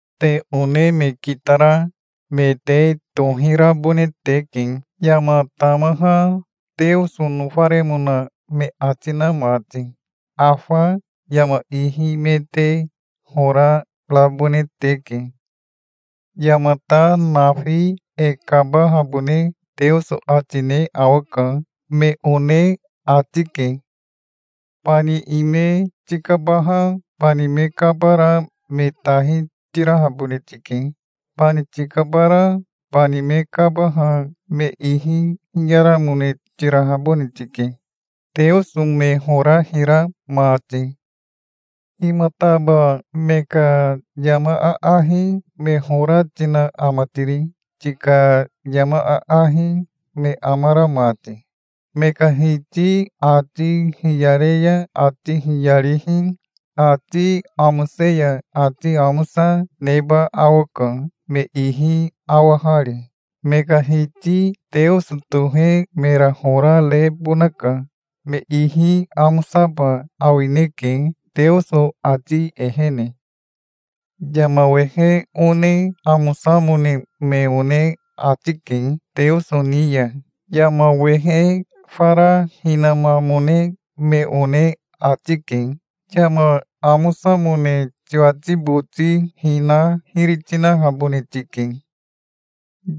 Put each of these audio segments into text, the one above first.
Te one me kitara me te tohirabone teke, yama tamaha Teoso nofaremona me ati na mati. Afa yama ihi me te hora rabone teke. Yamata nafi e kabahabone Teoso ati ne awaka, me one ati ke. Bani ime tikabaha bani me kabara me tahi tirahabone tike. Bani tikabara bani me kabaha me ihi hiyaramone tirahabone tike, Teoso me hora hira mati. Himataba me ka yama aahi me hora tina ama tiri, tika yama aahi me amara mati? Me ka hiti ati hiyare ya ati hiyarihi, ati amose ya ati amosa neba awaka, me ihi awahari. Me ka Hiti Teoso tohe mera hora rebonaka. Me ihi amosaba awineke Teoso ati ehene. Yama wehe one amosamone me one ati ke Teoso ni ya. Yama wehe fara hinamamone me one ati ke. Yama amosamone tiwati boti hina hiri tinahabone tike.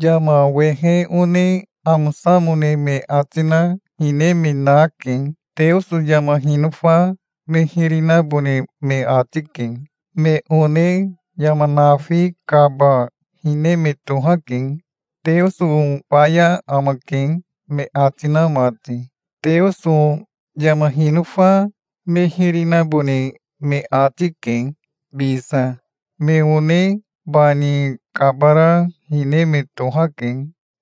Yama wehe one amosamone me ati na hine me nake. Teoso yama hinofa me hiri nabone me ati ke. Me one yama nafi kaba hine me tohake, "Teoso faya amake", me ati na mati. Teoso yama hinofa me hiri nabone me ati ke, bisa. Me one bani kabara hine me tohake,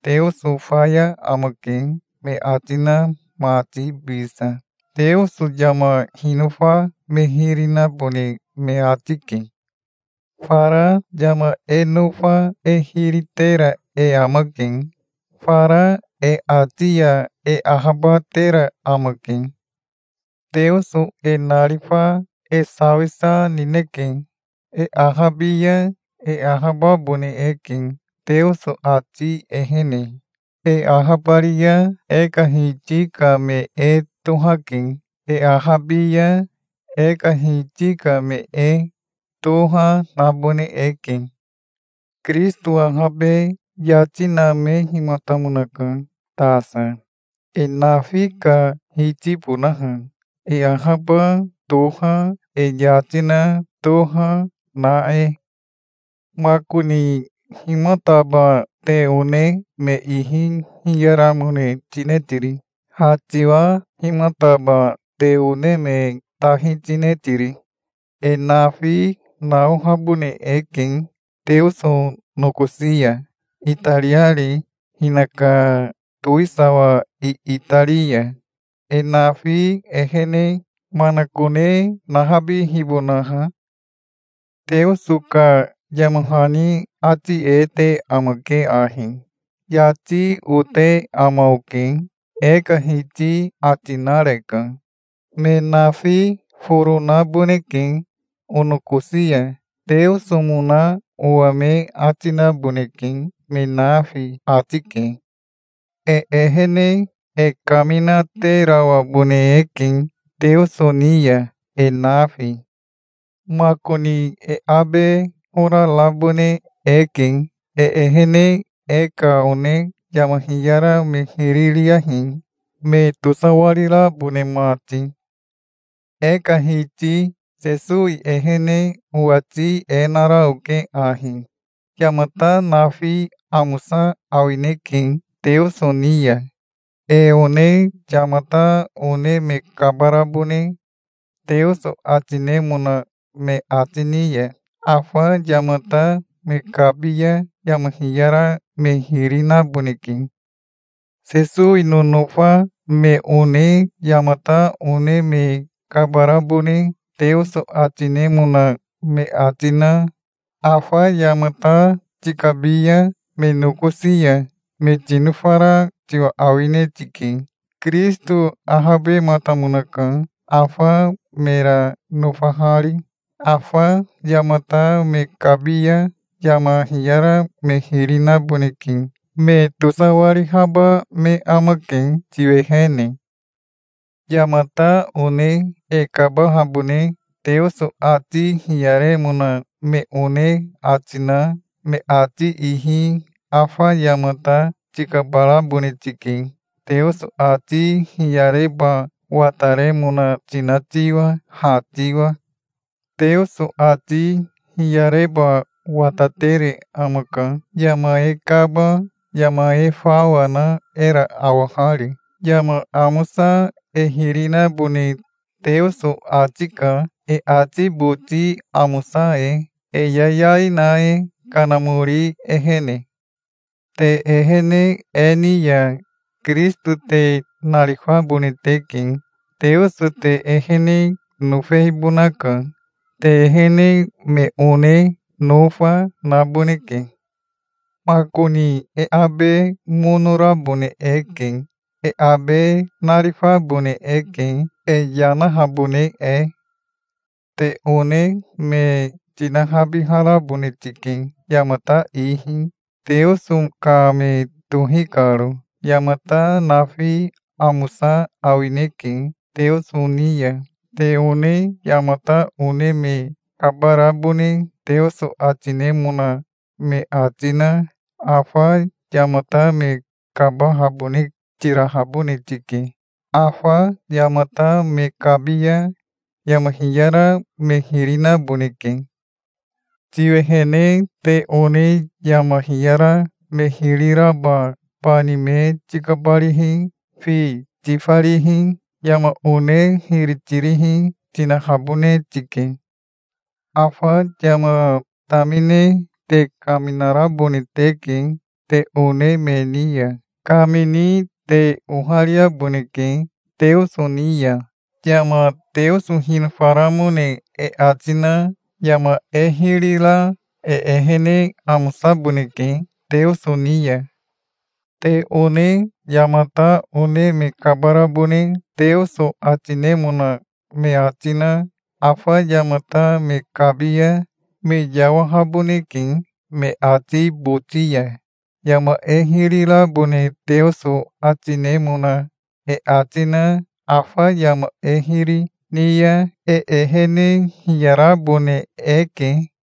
"Teoso faya amake", me ati na mati bisa. Teoso yama hinofa me hiri nabone me ati ke. Fara yama e nofa e hiri tera e amake. Fara e ati ya e ahabatera amake. Teoso e narifa e sawisa nineke. E ahabi ya e ahababone eke Teoso ati ehene. E ahabari ya e ka Hiti ka me e tohake. E ahabi ya e ka Hiti ka me e toha nabone eke. Kirisito ahabe yati namehimatamonaka tasa, e nafi ka Hitibonaha, e ahaba toha, e yati na toha na e. Makoni himataba te one me ihi hiyaramone tine tiri? Ha tiwa himataba te one me tahi tine tiri? E nafi naohabone eke Teoso nokosi ya, itariari hinaka towisawa iitari ya, e nafi ehene manakone nahabihibonaha. Teoso ka yama hani ati e te amake ahi: "'Yati ote ama oke', e ka Hiti ati nareka. Me nafi foro naboneke onokosi ya. Teosomona owa me ati naboneke, me nafi", ati ke. E ehene e kaminaterawabone eke Teoso ni ya e nafi. Makoni e abe hora rabone eke. E ehene e ka one yama hiyara me hiri riyahi, me tosawarirabone mati. E ka Hiti Sesowi ehene owati e nara oke ahi: Yamata nafi amosa awineke Teoso ni ya. E one yamata one me kabarabone Teoso ati nemona me ati ni ya, afa yamata me kabi ya yama hiyara me hiri naboneke. Sesowi nonofa me one yamata one me kabarabone Teoso ati nemona me ati na, afa yamata tikabi ya me nokosi ya, me tinofara tiwa awine tike. Kirisito ahabematamonaka, afa mera nofahari. Afa yamata me kabi ya yama hiyara me hiri naboneke. Me tosawarihaba me amake tiwehene. Yamata one e kabahabone Teoso ati hiyaremona me one ati na, me ati ihi afa yamata tikabarabone tike, Teoso ati hiyareba wataremona tina tiwa, ha tiwa. Teoso ati hiyareba watatere amaka, yama e kaba yama e fawa na era awahari. Yama amosa e hiri nabone Teoso ati ka e ati boti amosa e, e yayai na e, Kanamori ehene. Te ehene e ni ya Kirisito te narifabone teke. Teoso te ehene nofehibonaka. Te ehene me one nofa, naboneke. Makoni e abe mono rabone eke. E abe narifabone eke, e yanahabone e. Te one me tinahabiharabone tike yamata ihi, Teoso ka me tohi karo. Yamata nafi amosa awineke Teoso ni ya. Te one yamata one me kabarabone Teoso ati nemona me ati na, afa yamata me kabahabone tirahabone tike. Afa yamata me kabi ya yama hiyara me hiri naboneke. Tiwehene te one yama hiyara me hiri raba bani me tikabarihi, fi tifarihi, yama one hiri tirihi tinahabone tike. Afa yama tamine te kaminarabone teke te one me ni ya. Kamini te ohariaboneke Teoso ni ya. Yama Teoso hinofaramone e ati na yama e hiri ra e ehene amosaboneke Teoso ni ya. Te one yamata one me kabarabone Teoso ati nemona me ati na, afa yamata me kabi ya me yawahaboneke me ati boti ya. Yama e hiri rabone Teoso ati nemona e ati na afa yama e hiri ni ya e ehene hiyarabone eke.